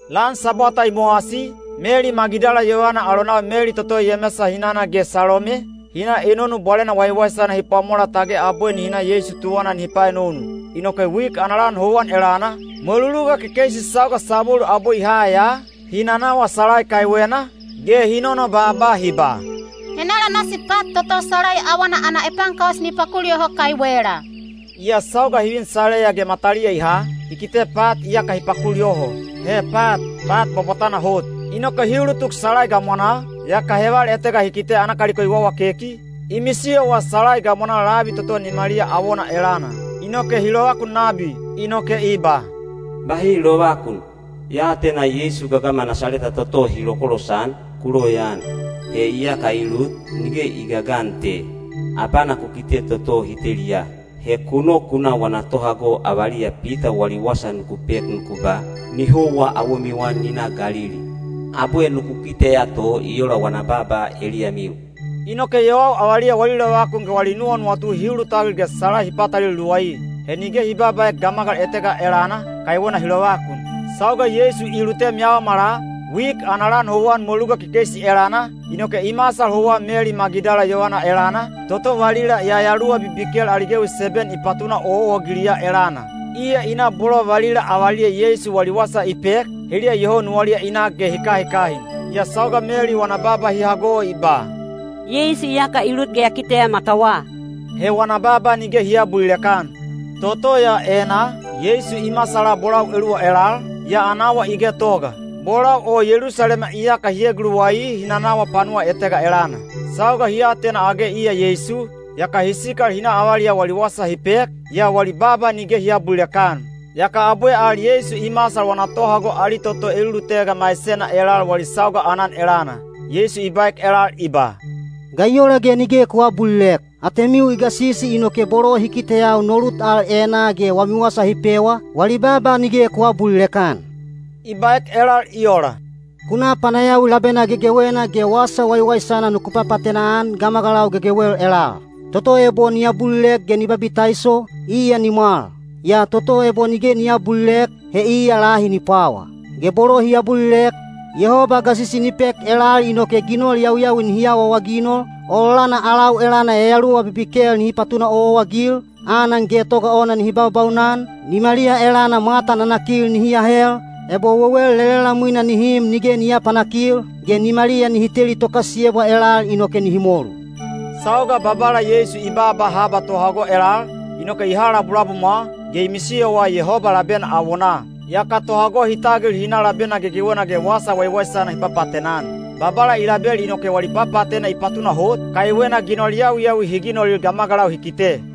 Lan Sabwata i mowasi, Meli Magidala yovana alonau Meli toto Yemesa hinana ge Salome, hi na enonu bwalena waiwaisana hi pwamolal tage abwe nihi na Yeisu tuwana nihi paenonu. Inoke wik ana lan houwan elana, mweluluga kekeisi sauga sabwelu abwe i ha ya, hi nanawa salai kaiwena, ge hi nonobaaba hi ba, “Henala nasi pat toto salai awana ana epaankaus ni pakul yoho kaiwela?” Yaa sauga hi vin salaiya ge mataliya i ha, hi kite pat iyaka hi pakul yoho. He pat, pat bwabwatana hot. Inoke hi ulutuk salai gamwanaa, yaka heval etega hi kite ana kaliko i wawakeki, i misiyowa salai gamwanaa labi toto nimaliya awona elana. Inoke hi lovakun nabi. Inoke i ba, “Bahi lovakun! Ya atena Yeisu gagama Nasaleta toto hi lokolosan, ku loyaan. He iyaka i lut, nige i gagan te. Abana ku kite toto hi teliya. He ku nok ku na wana tohago avaliya Pita wali wasa nuku pek nuku ba, ‘Ni houwa awomiwa ni na Galili. Abwe nuku kiteya to, i ola wana baaba eliyamiu.’” Inoke yowau avaliya wali lovakun ge wali nuwanuwatu hi ulutagil ge salai hi patalelu luwai. He nige hi babaaek gamagal etega elana, kaiwena hi lovakun. Sauga Yeisu i lutem yaomala, wik ana lan houwan mweluluga kekeisi elana, inoke i masal houwa Meli Magidala yovana elana, toto valila yayaluwa bibikel ali gewi seben i patuna owaowa-agiliya elana. Iya i na bolo valila avaliya Yeisu wali wasa i pek, heliya iyoho nuwaliya i nak ge hi kahikahin. Yaa sauga Meli wana baaba hi hago i ba, “Yeisu iyaka i lut ge ya kiteya matawa,” he wana baaba nige hi aabulilek-an. Toto ya enaa, Yeisu i masala bolau eluwa elal, yaa ana awa i getoga. Bolau o Yelusalema iyaka hi eguluwai hi nanawa panuwa etega elana. Sauga hi atena age iya Yeisu, yaka hi sikal hi na avaliyau wali wasa hi pek, yaa wali baaba nige hi aabulilek-an. Yaka abwe al Yeisu i masal wana tohago ali toto elulutega maisena elal wali sauga aanan elana. Yeisu i baek elal i ba, “Ga i ola ge nige ku aabulilek? Atemiu i gasisi inoke bolo hi kiteyau no lut al enaa ge wami wasa hi pewa, wali baaba nige ku aabulilek-an.” I baek elal i ola, “Ku na panayawi labena gegewena ge wasa waiwaisana nuku papaatena-an gamagalau gegewel elal. Toto ebo ni abulilek ge ni babitaiso, iya ni mwal. Yaa toto ebo nige ni aabulilek, he iya lahi ni pwawa. Ge bolo hi abulilek, Yehoba gasisi ni pek elal inoke ginol yawiyawi nihi awaawaginol, ololana alau elana yayaluwa bibikel nihi patuna owaowa-agil, anan getoga ona nihi baubaunan, nimaliya elana mwata nanakil nihi ahel, ebo wewel lelelamwina nihi im nige ni aapanakil, ge nimaliya nihi teli tokasiyebwa elal inoke nihi molu.” Sauga Babala Yeisu i baaba haba tohago elal, inoke i ha labulabumwa, ge i misiyowa Yehoba labena awonaa. Yaka tohago hi tagil hi na labena gegewena ge wasa waiwaisana hi papaatena-an. Babala i label inoke wali papaatena i patunahot, kaiwena ginol yawiyawi hi ginolil gamagalau hi kite.